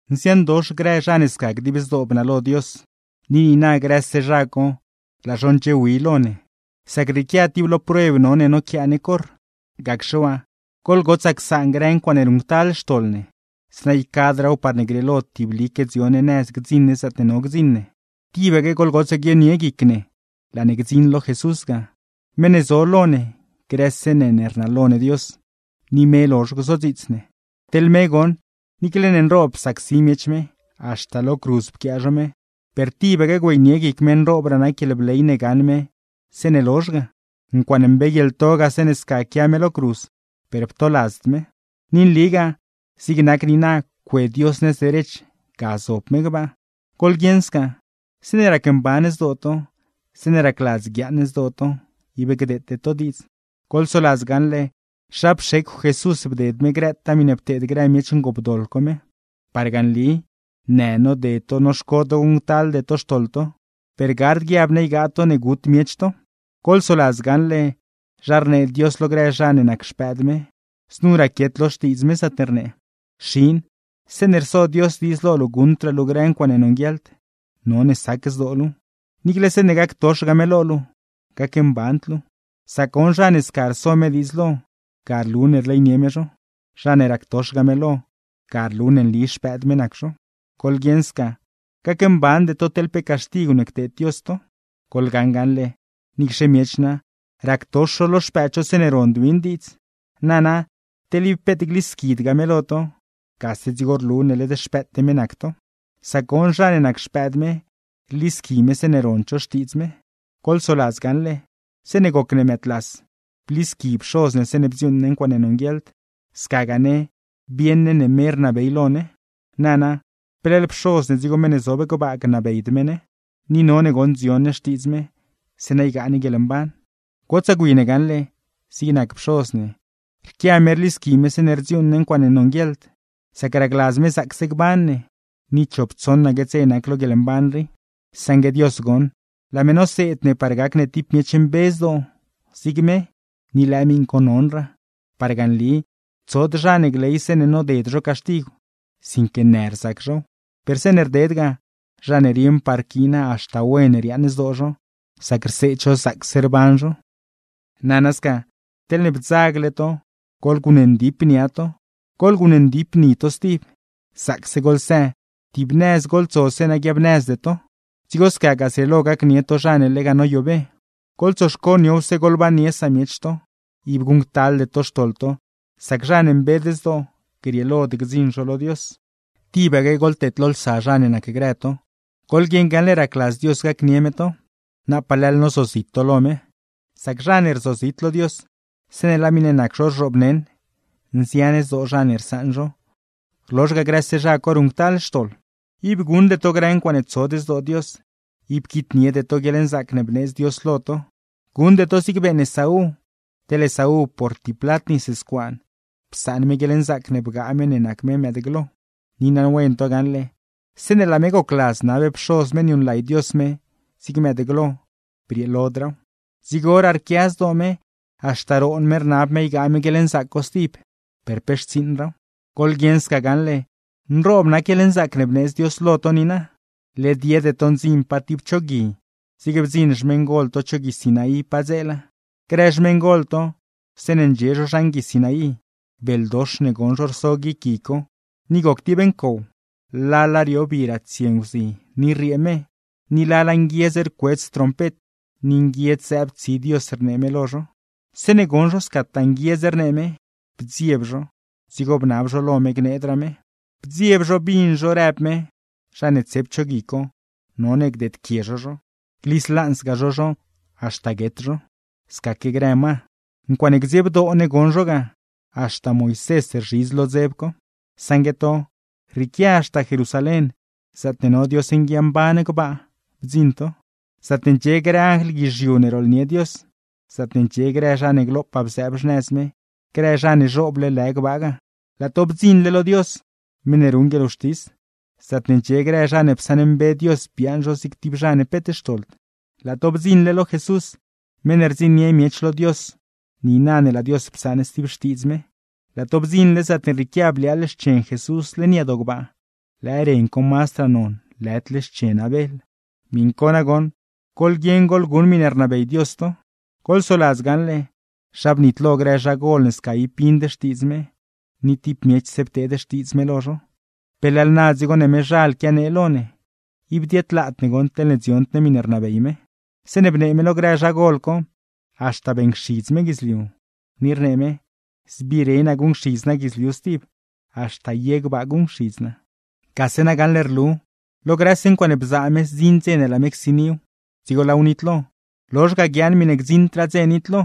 Nziandox grë zha ne sca dib zdoo bnalo Dios. Ni niina, grëse zha co laa zho ndxiewi lo ne; sac rrieequia tib lo prueb no ne noquiaa ne corr. Gacxe waa, goḻgotsaa csaan grë ncuaaṉe ruṉctal xtoḻ ne, zeeṉa ycadraaw parne grieelo tiblique dzio ne nëz gdziṉ ne zaatne no gdziṉ ne. Tibaque goḻgotsaa guionie guic ne laa ne gdziṉ lo Jesús ga, meṉ ne zo lo ne grëse ne ne rnalo ne Dios, ni me lozh gzodziits ne. Teḻ me goṉ, niicle ne nroob psacsi miech me, haxta lo cruz pquiaa zho me, per tibaque güeynie guic me nroobraa nac guieḻbley ne gaṉ me zeeṉe lozh ga. Ncuaaṉe mbeeguieḻto ga zeeṉe sca quia me lo cruz, per ptoladzd me. Ni nligaa, zig nac niina cue Dios nëz derech ga zob me gbaa. Goḻguieṉ sca, zeeṉe racmban zdoo to, zeeṉe racladz guiaaṉ zdoo to, ib gdeete to diidz; goḻsoladz gaṉle, zha pxecw Jesús bded me grëtaa miṉe pteed grë miech ngoopdoḻ co me. Parga nli, në noded to noxco to guṉctalde to xtoḻ to, per gard guiab ne ygaa to ne gut miech to. Goḻsoladz gaṉle zha rnee Dios lo grë zha ne nac xpëëd me. Znu raquiet lo Xtiidz me, zaatne rnee: Xin, zeeṉe rso Dios diidz lo luu guṉdraa luu grë ncuaaṉe nonguieḻd, none sac zdoo luuw; niicle zeeṉe gactoxgaa me lo luu, gacmband luu. Sac goṉ zha ne sca rso me diidz lo, ga rlu ne rleynie me zho; zha ne ractoxgaa me lo, ga rlu ne nli xpëëd me nac zho. Goḻguieṉ sca, gacmbande to teḻ pe caxtigw ne cteed Dios to. Goḻgaṉ gaṉle, niicxe miech na, ractox zho lo xpëëd zho zeeṉe rond win diidz. Nana, teḻ ib peet glisquidgaa me lo to, gase dzigo rlu ne led xpëëte me nac to; sac goṉ, zha ne nac xpëëd me, rlisqui me zeeṉe rond zho xtiidz me. Goḻsoladz gaṉle, zeeṉe rac ne mëëdlas rlisqui pxoz ne zeeṉe rdziuuṉ ne ncuaaṉe nonguieḻd; scagaa ne, rieṉ ne ne me rnabey lo ne. Nana, ¿pe leḻ Pxoz ne dzigo meṉ ne zob gbaa gnabeyd me ne? Ni none goṉ dzion ne xtiidz me, zeeṉa ygaa ne guieḻmban. Gotsaa gwi ne gaṉle, zig nac pxoz ne, rquia me rlisqui me zeeṉe rdziuuṉ ne ncuaaṉe nonguieḻd, sac racladz me zaacse gban ne, ni chop tsoṉaque dze nac lo guieḻmban rii; saṉgue Dios goṉ, laa me noseed ne par gac ne tib miech mbe zdoo, zig me; ni lëë miṉ co nonraa. Parga nli, tsod zha ne gley zeeṉe noded zho caxtigw, sinque në rzac zhow; per zeeṉe rded ga, zha ne rieṉpaa rquiina haxta wen riaaṉ zdoo zho, sac rseed zho zaacse rban zho. Nana sca, teḻne bdzagle to, goḻguṉ ndip nia to, goḻguṉ ndip ni to stib, zaacse goḻsë, tib nëz goḻtso zeeṉa gziaabnëzde to; dzigo scagaa zrieelo gacnie to zha ne lega noyobe. Goḻtsoxco niowse goḻbannie samiech to, ib guṉctalde to xtoḻ to; sac zha ne mbed zdoo, grieelod gdziṉ zho lo Dios. Tibaque goḻteedlolsa zha ne nacgrë to, goḻguieṉ gaṉle racladz Dios gacnie me to, napaa na leḻ nozozit to lo me. Sac zha ne rzozit lo Dios, zeeṉe laa miṉe nac zho rzhoobneṉ, nzian zdoo zha ne rsaṉ zho, rlozh ga grëse zha co ruṉctal xtoḻ. Ib guṉde to grë ncuaaṉe tsod zdoo Dios, ib quitniede to guieḻnzaac ne bneedz Dios lo to; guṉde to zigne beeṉ Esaú, teḻ Esaú, por tib plat nis scuaan psaan me guieḻnzaac ne bgaa me ne nac me mëëdglo; ni naṉwen to gaṉle, zeeṉe laa me gocladz nab pxoz me niuṉlay Dios me zig mëëdglo, brieelodraaw. Dzigoraa rquia zdoo me, haxta roon me rnab me ygaa me guieḻnzaac co stib, per pe xtsiiṉraaw. ¡Goḻguieṉ sca gaṉle, nroob nac guieḻnzaac ne bneedz Dios lo to niina! Led yede to ndziṉ pa tib cho gui, zig bdziṉ xmeṉgol to cho Gui Sinaí padzeela. Grë xmeṉgol to, zeeṉe ndxie zho zhan Gui Sinaí, beldox ne goṉ zho rso guic gui co, ni goc tib ncow, lala rio bi ratsie nguzi ni rriee me; ni lala nguiedz rcuedz trompet, ni nguiedz zëëb tsi Dios rnee me lo zho. Zeeṉe goṉ zho scataa nguiedz rnee me, bdzieb zho; dzigo bnab zho lo me gneedraa me. Bdzieb zho bin zho rëb me, zha ne tsep cho gui co none gdeedquie zho zho, gliz lanzgaa zho zho haxta guet zho; scaque grë ma. Ncuaaṉe gdziebdoo ne goṉ zho ga; haxta Moisés rzhidz lo dzeb co. Saṉgue to, rrieequia haxta Jerusalén, zaatne no Dios nguiamban gbaa bdziṉ to, zaatne ndxie grë anjl guizhiu ne rooḻnie Dios; zaatne ndxie grë zha ne glopaa bzëëb xnëz me, grë zha ne zhooble lë gbaa ga. Laa to bdziṉle lo Dios, meṉ ne ruṉ guieḻwxtis; zaatne ndxie grë zha ne psaṉmbe Dios biaaṉ zho zig tib zha ne peet xtoḻd. Laa to bdziṉle lo Jesús, meṉ ne rdziṉnie miech lo Dios niina ne laa Dios psaṉ stib xtiidz me; laa to bdziṉle zaatne rrieequia bliaaḻ xchen Jesús leṉ yadoo gbaa, lëë ren co mazdraa non lëdle xchen Abel. Miṉ co nagoṉ, goḻguieṉ goḻguṉ miṉe rnabey Dios to. Goḻsoladz gaṉle, zha bnitlo grë zhagol ne sca ib bind xtiidz me, ni tib miechse pteed xtiidz me lo zho. ¿Pe leḻ na dzigo ne mezhal quianee lo ne? Ib diedlaad ne goṉ teḻne dziond ne miṉe rnabey me. Zeeṉe bnee me lo grë zhagol co, haxta beeṉcxidz me guidzliu, ni rnee me: “Zbire naa guṉcxidz naa guidzliu stib, haxta ye gbaa guṉcxidz naa.” Gase na gaṉle rlu, lo grëse ncuaaṉe bzaa me zdziṉ ne laa me csiniw, dzigo laaw nitlo; lozh ga, guiaaṉ miṉe gdziṉdraa dze nitlo;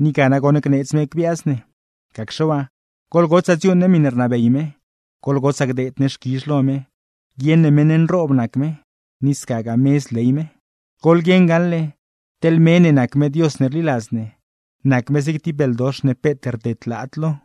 ni ga nagoṉ gneedz me gbiaaz ne. Gacxe waa, goḻgotsaa dziuuṉ ne miṉe rnabey me, goḻgotsaa gdeed ne xquizh lo me, guieṉ ne meṉ nroob nac me; ni scagaa me zley me. Goḻguieṉ gaṉle, teḻ me ne nac me Dios ne rliladz ne, nac me zig nac tib beldox ne peet rdedlaad lo.